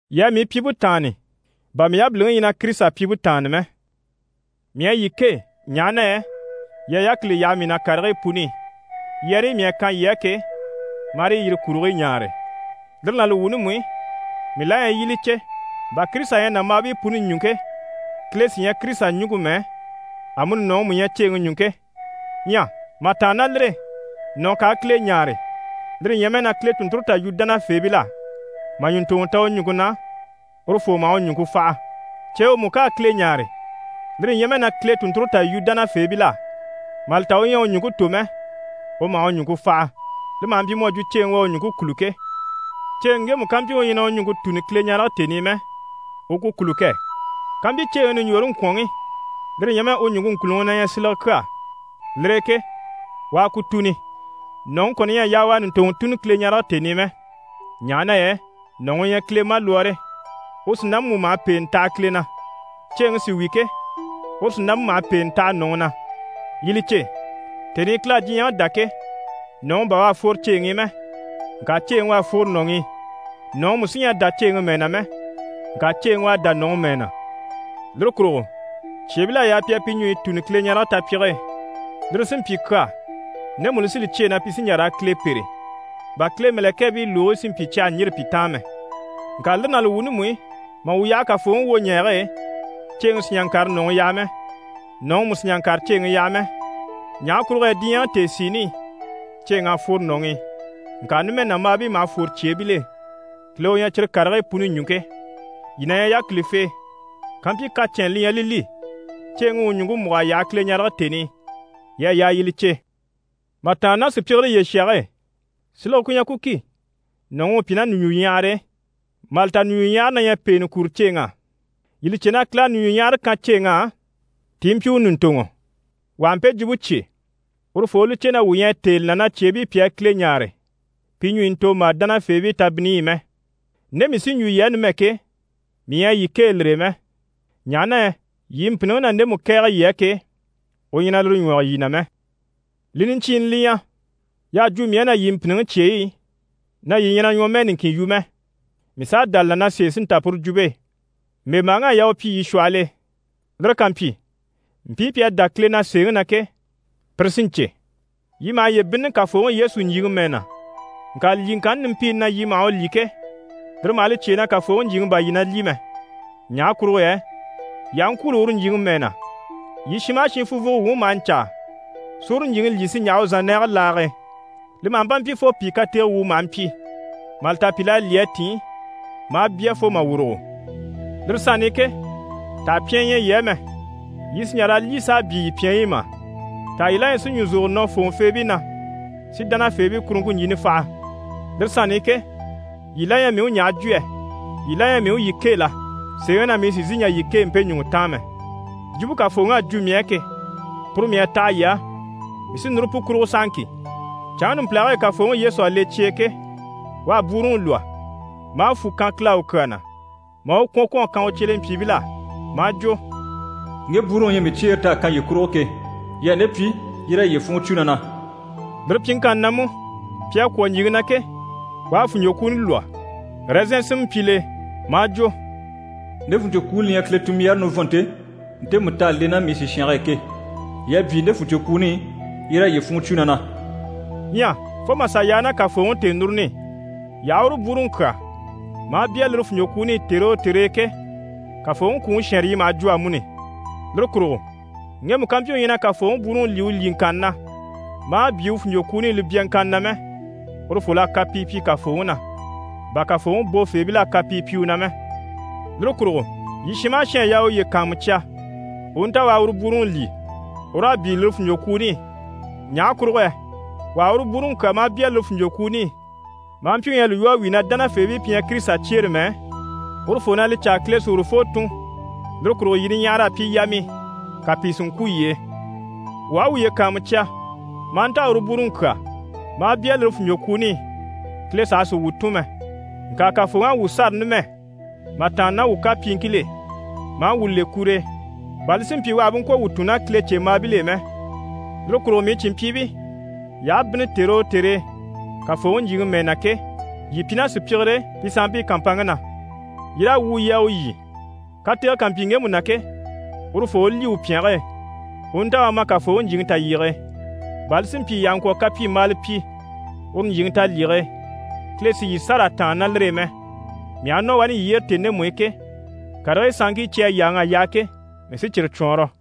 Yii a mii pyimpe taanni, bà mii yabiliŋi ɲyɛ na Kirisita pyimpe taanni mɛ. Mii à yii kêe, ɲaha na yɛ yii à yákili yaha mii na karigii puni i, yɛrɛyi mii à kan yii á ke, marii yire kurigii ɲaare. Lire ná li wuuni mú i, mii la ɲyɛ yii i li cè, bà Kirisita ɲyɛ nàmbaabii puni ɲùŋke, Kile sí ɲyɛ Kirisita ɲùŋke mɛ, amuni nɔ̀ŋi mú ɲyɛ ceeŋi ɲùŋke. Ɲyɛ mà tàanna ná lire e, nɔ̀ ká a Kile ɲáare, lire ɲyɛ mɛ na Kile tùnnture tà yu dánafeebil'á mà ɲùntoŋɔ ta u ɲùŋke na, urufoo maha u ɲùŋke faha. Ceewe mú ká a Kile ɲáare, lire ɲyɛ mɛ na Kile tùnnture tà yu dánafeebil'á, mà li ta u ɲyɛ a u ɲùŋke tò mɛ, u maha u ɲùŋke faha, li maha mpyi mu à jwo ceeŋi u à u ɲùŋke kûlu ke. Ceeŋi ŋgemu ká mpyi u ɲyɛ na u ɲùŋke tùni Kileɲarege tèni i mɛ, u ku kûlu kɛ! Kampyi ceeŋi ɲùɲjoore ŋkwɔ̀nŋi, lire ɲyɛ mɛ u ɲùŋke ŋkùluŋi na ɲyɛ silege kyaa, lire e ke, u a ku tùni. Nɔ̀ŋi kɔni ɲyɛ a yaa u a ɲùntoŋɔ tùni Kileɲarege tèni i mɛ, ɲaha na yɛ nɔ̀ŋi u ɲyɛ Kile malwɔɔre, u sìnampe mú maha pèenɛ taha Kile na. Ceeŋi sí wi ke, uru sìnampe maha pèenɛ taha nɔ̀ŋi na. Yii li cè, tèni i Kile à diɲyɛŋi dá ke, nɔ̀ŋi bà u à fworo ceeŋi i mɛ, ŋka ceeŋi u à fworo nɔ̀ŋi i. Nɔ̀ŋi mú sí ɲyɛ a dá ceeŋi mɛɛ na mɛ. Ŋka ceeŋi u à dá nɔ̀ŋi mɛɛ na. Lire kurugo cyeebil'à yaa pi a pi ɲùɲyi tùni Kileɲarege tapyige e, lire sí n‑pyi kyaa ndemu li sí li cyêe na pi sí n‑jà raa Kile pêre, bà Kile mɛ̀lɛkɛɛbii lùgigii si mpyi cyi àha ɲjîri pi taan mɛ. Ŋka lire ná li wuuni mú i, mà wuu yaha Kafooŋi wwoɲɛɛge e, ceeŋi sì n‑jà n‑kàre nɔ̀ŋi yaha mɛ, nɔ̀ŋi mú sì n‑jà n‑kàre ceeŋi yaha mɛ. Ɲaha kurugo yɛ diɲyɛŋi tèesiini i, ceeŋ'à fworo nɔ̀ŋi i. Ŋka numɛ nàmbaabii maha fwore cyeebil'e. Kile u ɲyɛ cyire karigii puni ɲùŋke. Yii na ɲyɛ yákilifee. Kampyi kacɛnnɛ li ɲyɛ li li, ceeŋi u u ɲùŋke múg'a yaha Kileɲarege tèni i, yii à yaa yii li cè. Mà tàanna ná sùpyigire yyeshage e, silege ku ɲyɛ ku ki, nɔ̀ŋi u pyi ná ɲùɲjuɲyahare e. Mà li ta niɲjuɲyahare na ɲyɛ pèenɛ kuro ceeŋ'á. Yii li cè na Kile à ɲùɲjuɲyahare kan ceeŋ'á ti i mpyi u ɲùntoŋɔ. Wà ha mpe jwumpe cyé, urufoo u li cè na wuu ɲyɛ a têe li na cyeebii pi a Kile ɲáare pi ɲùɲyi ntòmbaa dánafeebii tabinniyi i mɛ. Nde mii sí n‑jwo yii á numɛ ke, mii ɲyɛ a yii kêe lire e mɛ, ɲaha na yɛ yii mpìnniŋi na ndemu kɛ̀ɛge yii á ke, u ɲyɛ na lire ɲwɔge yii na mɛ. Li niɲcyiini li ɲyɛ, y'à jwo mii á na yii mpìnniŋi cyeyi i, na yii ɲyɛ na ɲwɔmɛɛ niŋkin yu mɛ, mii s'à dá li na, na sèe sí n‑ta puru jwumpe e. (Mbèmbaaŋ'à yaa u pyi yii shwɔhɔl'e, lire ká mpyi mpii pi à dá Kile na sèeŋi na ke, pire sí n‑cè.) Yii maha yiye bínnini Kafooŋi Yesu ɲjyìŋi mɛɛ na, ŋka lyìŋkanni nimpiini na yii maha u lyî ke, lire maha li cyêe na Kafooŋi ɲjyìŋi bà yii na lyî mɛ. Ɲaha kurugo yɛ yii aha ŋkwûulo uru ɲjyìŋi mɛɛ na, yii shin maha shin funvwugo wuŋi maha ɲcaa si uru ɲjyìŋi lyî si ɲjaha u zànnɛɛge laage e. Li maha mpa mpyi fo pìi katege wuu maha mpyi, mà li ta pìl'à lyî a tìn maa bya fo mà wùrugo. Lire sanni i ke, taha pyɛnyɛ ɲyɛ yii á mɛ? Yii sì n‑jà raa lyî s'a byii yii pyɛnyi i mà? Taha yii la ɲyɛ si ɲùzogoro nɔ fòŋɔfeebii na si dánafeebii kuruŋke ɲjini faha? Lire sanni i ke, yii la ɲyɛ mii u ɲaha jwo yɛ? Yii la ɲyɛ mii u yii kêe la? Sèeŋi na, mii sì n‑sìi n‑jà yii kêe mpe ɲùŋɔ taan mɛ! Jwumpe Kafooŋi à jwo mii á ke, puru mii à taha yii á, mii sí núru pu kurugo sahaŋki: canŋke numpilage e Kafooŋi Yesu à le cye e ke, u à bwúuruŋi lwɔ́, maa fwù kan Kile á u kyaa na, maa u kwɔ̀n kwɔ̀n a kan u cyelempyiibil'á maa jwo: «Ŋge bwúuruŋi u ɲyɛ mii cyeere t'à kan yii kurugo ke, yii a nde pyi yii raa yiye funŋɔ cwo na na.» Lire pyiŋkanni na mú, pi à kwɔ̀ ɲjyìŋi na ke, u à fùnɲcwokwuuni lwɔ́, ɛrɛzɛn sinmɛ mpyi l'e, maa jwo: «Nde fùnɲcwokwuuni li ɲyɛ Kile tunmbyaare nivɔnnte, ntemu t'à le ná mii sìshange e ke. Yii a byii nde fuɲcwokwuuni i, yii raa yiye funŋɔ cwo na na.» Ɲyɛ fo mà sà yaa ná Kafooŋi tèenuruni i, yii aha uru bwúuruŋi kyà maa bya lire fùnɲcwokwuuni i tère o tère e ke, Kafooŋi kwùŋi shɛnrɛ yii maha jwo amuni. Lire kurugo ŋgemu ká mpyi u ɲyɛ na Kafooŋi bwúuruŋi lyî u lyìŋkanna na maa byii u fùnɲcwokwuuni i li byaŋkanna na mɛ, urufol'à kapii pyi Kafooŋi na, bà Kafooŋi bofeebil'à kapii pyi u na mɛ. Lire kurugo yii shin maha shin à yaa u uye kàanmucya, u u nta u a uru bwúuruŋi lyî, u raa byii lire fùnɲcwokwuuni i. Ɲaha kurugo yɛ wà ha uru bwúuruŋi kyà maa bya lire fùnɲcwokwuuni i, maa mpyi u ɲyɛ a li lwɔ́ a wíi na dánafeebii pi ɲyɛ Kirisita cyeere mɛ, urufoo na li caa Kile sí urufoo tùn. Lire kurugo yii niɲyahara à pyi yamii, ka pìi si ŋkwû yii e. Wuu aha wuye kàanmucya maa nta a uru bwúuruŋi kyà, maa bya lire fùnɲcwokwuuni i, Kile saha sì wuu tùn mɛ. Ŋka Kafooŋi à wuu sâra numɛ mà tàanna ná wuu kapyiiŋkil'e, maa wuu le kur'e, bà li si mpyi u àha bú ŋkwɔ̀ wuu tùn ná Kilecembaabil'e mɛ. Lire kurugo mii cìnmpyiibii, yii aha bínni tère o tère e Kafooŋi ɲjyìŋi mɛɛ na ke, yii pyi ná sùpyigire e pi sanmpii kàmpanŋke na, yii raa wwùu yii a u lyî. Katege ká mpyi ŋgemu na ke, urufoo u lyî u pyɛnge e, u u nta u a ma Kafooŋi ɲjyìŋi talyige e, bà li si mpyi yii àha ŋkwɔ̀ kapyimbaala pyi uru ɲjyìŋi talyige e, Kile si yii sâra a tàanna ná lire e mɛ. Mii aha nɔ wani yii yyére tèni ndemu i ke, karigii sanŋkii cyi à yáaŋa a yaha ke, mii sí cyire cwɔɔnrɔ.